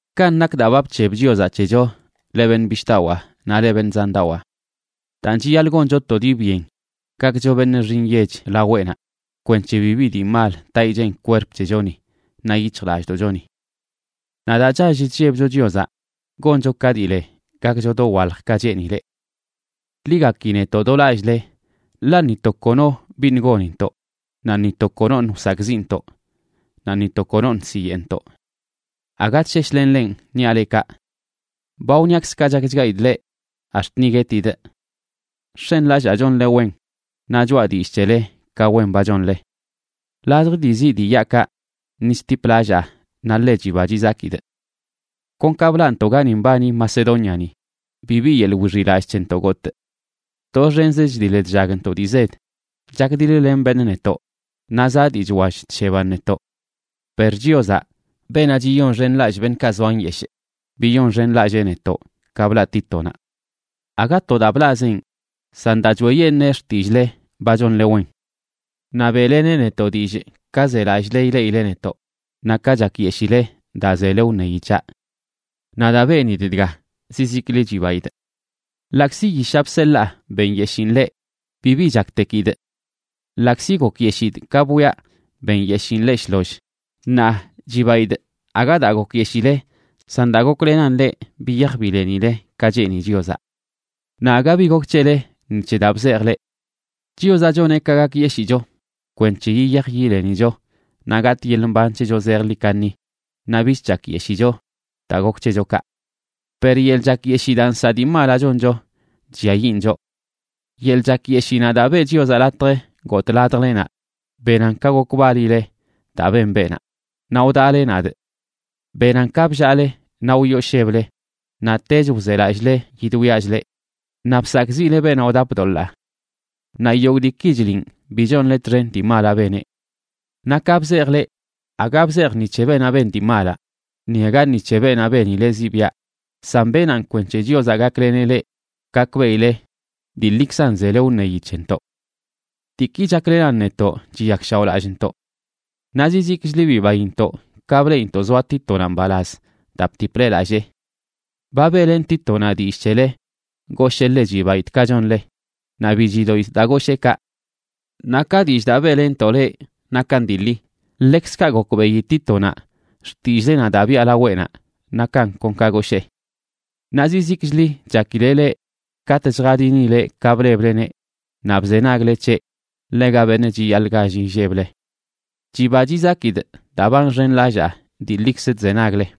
Kanꞌ nak daa ba bc̱heb Chiozaꞌ c̱hecho, leꞌ beṉꞌ bishꞌdawaa naꞌ leꞌ beṉꞌ zandawaa. Daan, chiyaḻꞌ goncho to dii byen gakcho beṉꞌ nxi nyech laweꞌnaꞌ kwenc̱he bibi dii mal taꞌ ichen kwerp c̱hechoni naꞌ yic̱hjlallꞌdoꞌchoni. Naꞌ daa chall chllebcho Chiozaꞌ goncho ka dii le gakcho dowalj ka cheenileꞌ. Ḻi gaki netoꞌ do lallꞌle. Ḻaꞌ ni to kono biṉꞌ gonintoꞌ, naꞌ ni to konoṉꞌ wsakꞌziꞌntoꞌ, naꞌ ni to konoṉ siyeꞌntoꞌ. Aga chsheshlenꞌ lenꞌ niaꞌ leꞌ kaꞌ. Ba wṉiaꞌkzꞌ ka chakchgaidꞌ leꞌ ax̱t ni guetidꞌ. Nx̱enlallaa chonle wen, naꞌ choꞌa dillꞌ c̱hele ka wen ba chonle. Ladj dii ziꞌ dii yaꞌkaꞌ ni chtiplallaa naꞌ ḻe chiba chizakidꞌ. Kon ka blaꞌntoꞌ gani mbani Macedóniani, bibi yeḻꞌ wixiꞌlallꞌ c̱hentoꞌ gotꞌ. Doxenzə chdiḻ chllagntoꞌ dii zed, chakdiḻ-len beṉꞌ netoꞌ, naꞌ zaꞌ dii chwall chsheban netoꞌ. Per Chiozaꞌ, beenaꞌ chiyonxenlallꞌ beṉꞌkaꞌ zoa nyeshꞌ, biyonxenlallee netoꞌ ka blaꞌ Títonaꞌ. Aga to daa blaꞌzeꞌn, san daa choeꞌyeṉee xtillꞌle ba chonle wen. Naꞌ beꞌleneꞌ netoꞌ dillꞌ ka zelallꞌle ileꞌile netoꞌ naꞌ ka chakyeshile daa zele wṉeyi c̱haꞌ. Naꞌ daa benidꞌ dga zizikli chibaidꞌ. Ḻaꞌkzi yishaꞌ bseḻaa benyeshiin leꞌ, bibi chaktekidꞌ. Ḻaꞌkzi gokyeshidꞌ ka bwiaꞌ benyeshiin leꞌ shloll, ṉaa chibaidꞌ, aga daa gokyeshile, san daa goklenan leꞌ biyaj bilenile ka cheeni Chiozaꞌ. Naꞌ aga bi gok c̱hele ni c̱he daa bzejꞌ leꞌ. Chiozaꞌ choneꞌ ka gakyeshicho kwenc̱he yiyaj yilenicho naꞌ gatꞌ yeḻꞌ mban c̱hecho zejḻi kaṉi, naꞌ bich chakyeshicho daa gok c̱hecho kaꞌ. Per yeḻꞌ chakyeshii daa nsaꞌ dii malaꞌ choncho chlliayiꞌn choꞌ. Yeḻꞌ chakyeshiinaꞌ daa beꞌ Chiozaꞌ latj gotꞌ ladjlenaꞌ benan ka gokbalileꞌ daa ben beenaꞌ, naꞌ wdaꞌle nadꞌ. Benan ka bllaale naꞌ wyoosheble, naꞌtech wzelallꞌle yidwiachꞌ leꞌ, naꞌ bsakꞌziꞌle beenaꞌ wdap doḻaa. Naꞌ yogꞌ diiki chliꞌn bi nonle txen dii malaꞌ beneꞌ. Naꞌ ka bzejꞌ leꞌ, aga bzejꞌ ni c̱he beenaꞌ ben dii malaꞌ, ni aga ni c̱he beenaꞌ benileꞌ ziꞌbiaꞌ, san benaꞌn kwenc̱he Chiozaꞌ gakleneꞌ leꞌ gakbeꞌile dii ḻikzan zele wṉeyi c̱hentoꞌ. Diiki chaklenan netoꞌ chiyakshaoꞌlallꞌntoꞌ. Naꞌ zizikchli bibaintoꞌ ka bleꞌinto zoa Títonaꞌ mbalaz daa btiple lallee. Ba beꞌlenꞌ Títonaꞌ dillꞌ c̱hele, goshee ḻe chibaidꞌ ka chonle, naꞌ bi chidoꞌidꞌ daa goshee kaꞌ. Naꞌ ka dillꞌ daa beꞌlenntoꞌ leꞌ nakan dii ḻi, ḻekzkaꞌ gokbeꞌi Títonaꞌ xtillꞌlenaꞌ daa biꞌa laweꞌnaꞌ nakan kon ka goshee. Naꞌ zizikchli chakileꞌ leꞌ katꞌ chjadinileꞌ ka blebleneꞌ naꞌ bzenagle c̱heꞌ ḻega beṉꞌ chiyaḻꞌ gall illeble. Chiba chizakidꞌ daa ba nxenlallaa dii ḻikzə chzenagle.